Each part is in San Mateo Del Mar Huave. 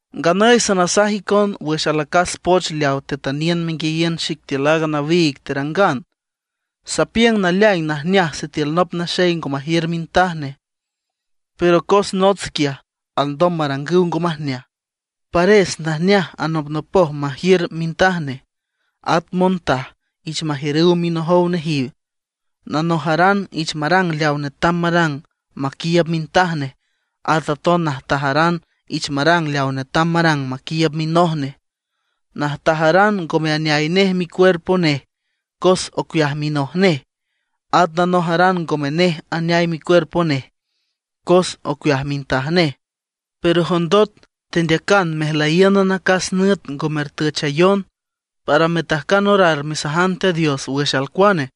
Nganüy sanasaj icon wüx alacas poch leaw tetüniün menguiayiün xic tiül aaga nawiig terangan. Sapiüng naleaing najneaj sitiül nop naxey ngo majiür mintaj nej. Pero cos nots quiaj alndom marangüw ngo majneaj, pares najneaj anopnopoj majiür mintaj nej, at montaj ich majiürüw minojow nejiw. Nanojaran ich marang leaw netam marang maquiiüb mintaj nej; at aton najtajaran ich marang leaw netam marang maquiiüb minoj nej. Najtajaran ngome aneay nej micuerpo nej, cos ocueaj minoj nej. At nanojaran ngome nej aneay micuerpo nej, cos ocueaj mintaj nej. Pero jondot tendeacan mejlüyíünan acas nüt ngo mertüchayon, para metajcan orar mesajan Teat Dios wüx alcuane;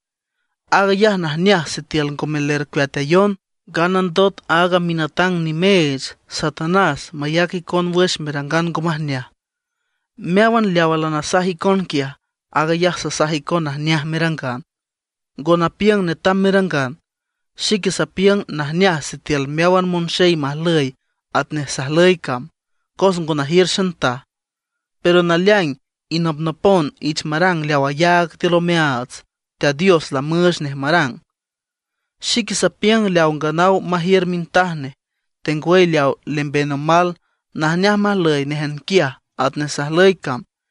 aag ayaj najneaj sitiül ngome lercueatayon, nganandot aaga minatang nimeech Satanás mayac icon wüx merangan ngo majneaj. Meáwan leawa lanasaj icon quiaj, aag ayaj sasaj icon najneaj merangan; ngo napiüng netam merangan. Xique sapiüng najneaj sitiül meáwan monxey majlüy atnej sajlüy cam, cos ngo najiür xantaj; pero naleaing inopnopon ich marang leaw ayaag tiül omeaats Teat Dios lamüüch nej marang. Xique sapiüng leaw nganaw majiür mintaj nej, tengwüy leaw lemben omal, najneaj majlüy néjan quiaj atnej sajlüy cam.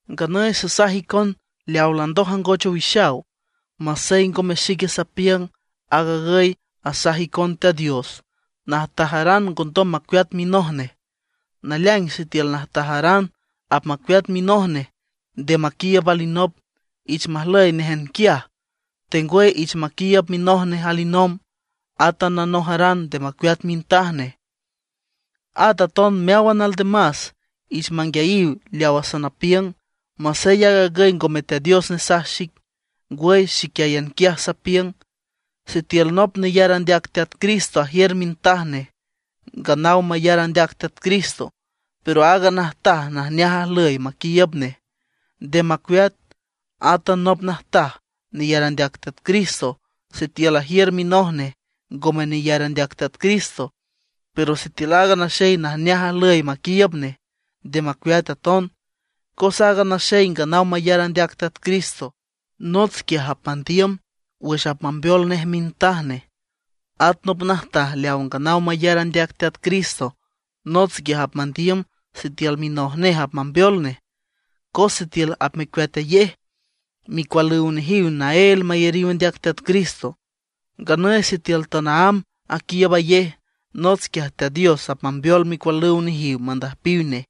Nganüy sasaj icon leawa landoj angoch iwixan, masey ngome xique sapiüng, aag agüy asaj icon Teat Dios: Najtajaran ngondom macueat minoj nej. Naleaing sitiül najtajaran apmacueat minoj nej nde maquiiüb alinop, ich majlüy néjan quiaj, tengwüy ich maquiiüb minoj nej alinomb. Átan nanojaran nde macueat mintaj nej. At aton meáwan aldemas, ich manguiayiw leawa sanapiüng, masey aag agüy ngome Teat Dios nesaj xic, ngwüy xiquiáyan quiaj sapiüng: Sitiül nop neyar andeac Teat Cristo ajiür mintaj nej nganaw mayar andeac Teat Cristo, pero aaga najtaj najneaj ajlüy maquiiüb nej, nde macueat. Átan nop najtaj neyar andeac Teat Cristo, sitiül ajiür minoj nej ngome neyar andeac Teat Cristo, pero sitiül aaga naxey najneaj ajlüy maquiiüb nej, nde macueat aton. Cos aaga naxey nganaw mayar andeac Teat Cristo, nots quiaj apmandiüm wüx apmambeol nej mintaj nej. At nop najtaj leaw nganaw mayar andeac Teat Cristo, nots quiaj apmandiüm sitiül minoj nej apmambeol nej. Cos sitiül apmecueatayej, micualüw nejiw naél mayariw andeac Teat Cristo. Nganüy sitiül tanaámb aquiiübayej, nots quiaj Teat Dios apmambeol micualüw nejiw mandüjpiw nej.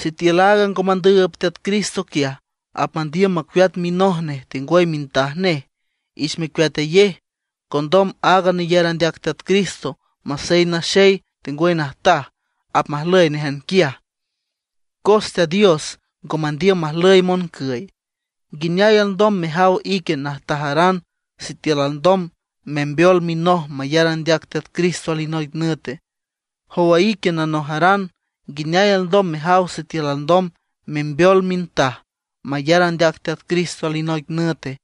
Sitiül aaga ngo mandüüb Teat Cristo quiaj, apmandiüm macueat minoj nej tengwüy mintaj nej, ich mecueatayej. Condom aaga neyar andeac Teat Cristo, masey naxey tengwüy najtaj, apmajlüy néjan quiaj, cos Teat Dios ngo mandiüm majlüy moncüy. ¿Nguineay alndom mejaw ique najtajaran, sitiül alndom membeol minoj mayar andeac Teat Cristo alinoic nüte? ¿Jow ique nanojaran, nguineay alndom mejaw sitiül alndom membeol mintaj mayar andeac Teat Cristo alinoic nüte?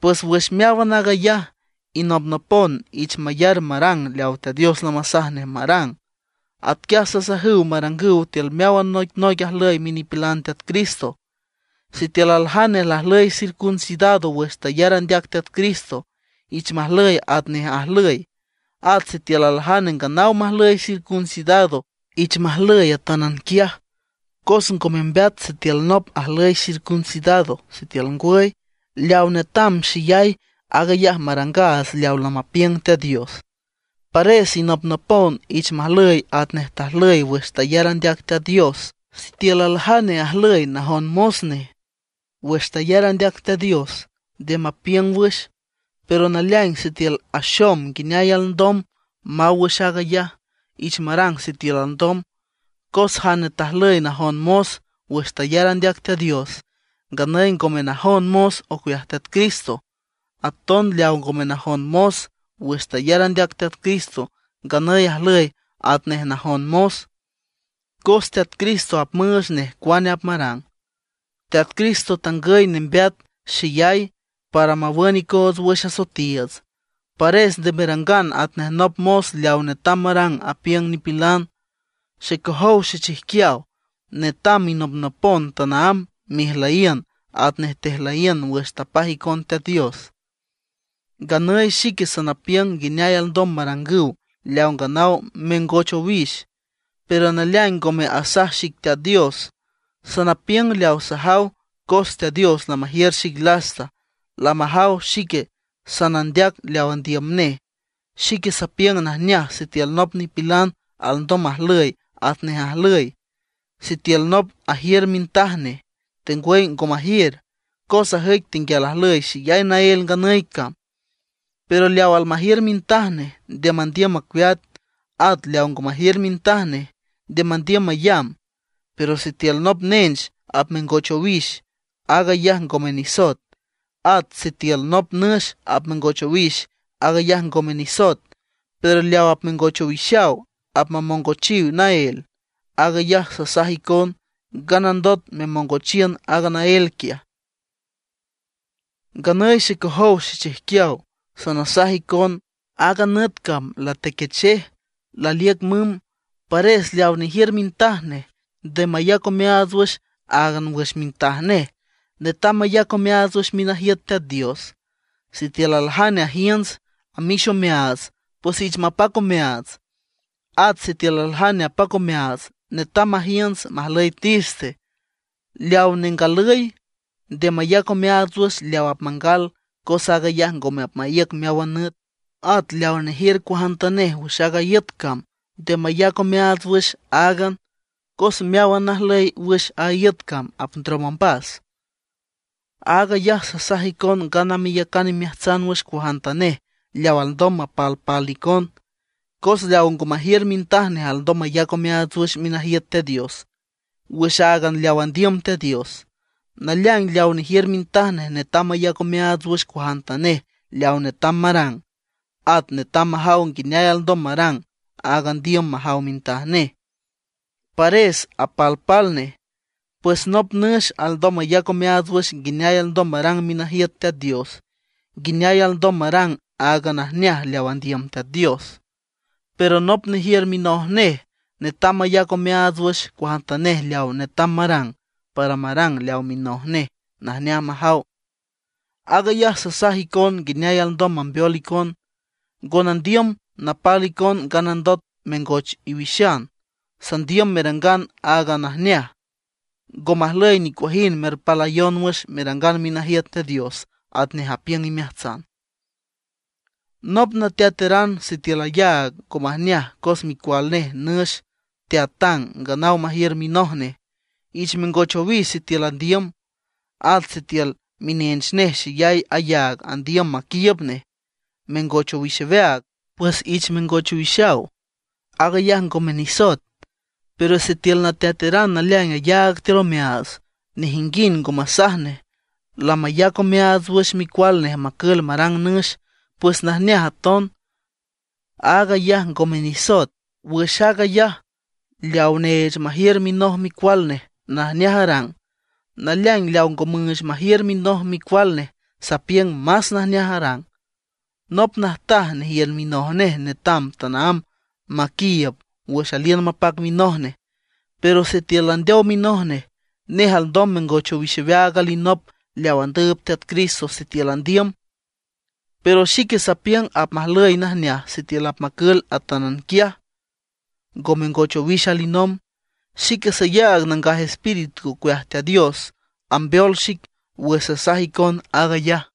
Pues wüx meáwan aag ayaj, inopnopon ich mayar marang leaw Teat Dios lamasaj nej marang. Atquiaj sasajüw marangüw tiül meáwan noicnoic ajlüy minipilan Teat Cristo. Sitiül aljane lajlüy circuncidado wüx tayar andeac Teat Cristo, ich majlüy atnej ajlüy. At sitiül aljane nganaw majlüy circuncidado, ich majlüy atánan quiaj. Cos ngo membeat sitiül nop ajlüy circuncidado, sitiül ngwüy. Leaw netam xeyay, aag ayaj marangaats leaw lamapiüng Teat Dios. Pares inopnopon ich majlüy atnej tajlüy wüx tayar andeac Teat Dios. Sitiül aljane ajlüy najon mos nej wüx tayar andeac Teat Dios, nde mapiüng wüx. Pero naleaing sitiül axom nguineay alndom maw wüx aag ayaj, ich marang sitiül alndom. Cos jane tajlüy najon mos wüx tayar andeac Teat Dios, nganüy ngome najon mos ocueaj Teat Cristo. Aton leaw ngome najon mos wüx tayar andeac Teat Cristo, nganüy ajlüy atnej najon mos, cos Teat Cristo apmüüch nej cuane marang. Teat Cristo tangüy nembeat xeyay para mawün icoots wüx asoetiiüts; pares nde merangan atnej nop mos leaw netam marang apiüng nipilan. Xecojow xechijquiaw, netam inopnopon tanaámb mejlüyiün atnej tejlüyiün wüx tapaj icon Teat Dios. Nganüy xique sanapiüng nguineay alndom marangüw leaw nganaw mengoch owix. Pero naleaing ngome asaj xic Teat Dios; sanapiüng leaw sajaw cos Teat Dios lamajiür xic lasta, lamajaw xique sanandeac leaw andiüm nej. Xique sapiüng najneaj sitiül nop nipilan alndom majlüy atnej ajlüy, sitiül nop ajiür mintaj nej, tengwüy ngo majiür; cos ajüic tenguial ajlüy xeyay naél nganüy cam. Pero leaw almajiür mintaj nej, nde mandiüm macueat; at leaw ngo majiür mintaj nej, nde mandiüm mayamb. Pero sitiül nop nench apmengoch owix, aag ayaj ngome nisoet. At sitiül nop nüx apmengoch owix, aag ayaj ngome nisoet. Pero leaw apmengoch owixaw apmamongochiw naél. Aag ayaj sasaj icon, nganandot memongochiün aaga naél quiaj. Nganüy xecojow xechijquiaw, sanasaj icon: Aaga nüt cam latequechej, laliüc mümb. Pares leaw nejiür mintaj nej, nde mayac omeaats áagan wüx mintaj nej, netam mayac omeaats wüx minajiüt Teat Dios. Sitiül aljane ajiünts, amix omeaats, pues ich mapac omeaats; at sitiül aljane apac omeaats, netam majiünts, majlüy triste. Leaw nengalüy, nde mayac omeaats wüx leaw apmangal cos aag ayaj ngome apmaíüc meáwan nüt. At leaw nejiür cuajantanej wüx a iüt cam nde mayac omeaats wüx áagan, cos meáwan najlüy wüx a iüt cam apndrom ombas. Aag ayaj sasaj icon ngana meyacan imeajtsan wüx cuajantanej leaw alndom mapalpal icon. Cos leaw ngo majiür mintaj nej alndom mayac omeaats wüx minajiüt Teat Dios, wüx áagan leaw andiüm Teat Dios. Naleaing leaw nejiür mintaj nej netam mayac omeaats wüx cuajantanej leaw netam marang. At netam majaw nguineay alndom marang aag andiüm majaw mintaj nej; pares apalpal nej. Pues nop nüx alndom mayac omeaats wüx nguineay alndom marang minajiüt Teat Dios, nguineay alndom marang áagan najneaj leaw andiüm Teat Dios. Pero nop nejiür minoj nej, netam mayac omeaats wüx cuajantanej leaw netam marang, para marang leaw minoj nej najneaj majaw. Aag ayaj sasaj icon nguineay alndom nambeol icon, ngo nandiüm napal icon nganandot mengoch iwixan. Sandiüm merangan áagan najneaj, ngo majlüy nicuajind merpalayon wüx merangan minajiüt Teat Dios atnej apiüng imeajtsan. Nop nateataran sitiül ayaag ngo majneaj cos micual nej nüx teatang nganaw majiür minoj nej, ich mengoch owix sitiül andiüm. At sitiül minench nej xeyay ayaag andiüm maquiiüb nej, mengoch owix aweaag, pues ich mengoch owixaw, aag ayaj ngome nisoet. Pero sitiül nateataran naleaing ayaag tiül omeaats, nejinguind ngo masaj nej, lamayac omeaats wüx micual nej macül marang nüx, pues najneaj aton, aag ayaj ngome nisoet. Wüx aag ayaj, leaw neech majiür minoj micual nej, najneaj arang. Naleaing leaw ngo müüch majiür minoj micual nej, sapiüng más najneaj arang. Nop najtaj nejiür minoj nej netam tanaámb maquiiüb wüx aliün mapac minoj nej. Pero sitiül landeow minoj nej, nej alndom mengoch owix aweaag alinop leaw andüüb Teat Cristo sitiül andiüm. Pero xique sapiüng apmajlüy najneaj sitiül apmacül atánan quiaj, ngo mengoch owix alinomb. Xique sayaag Nangaj Espíritu ocueaj Teat Dios ambeol xic wüx sasaj icon aag ayaj.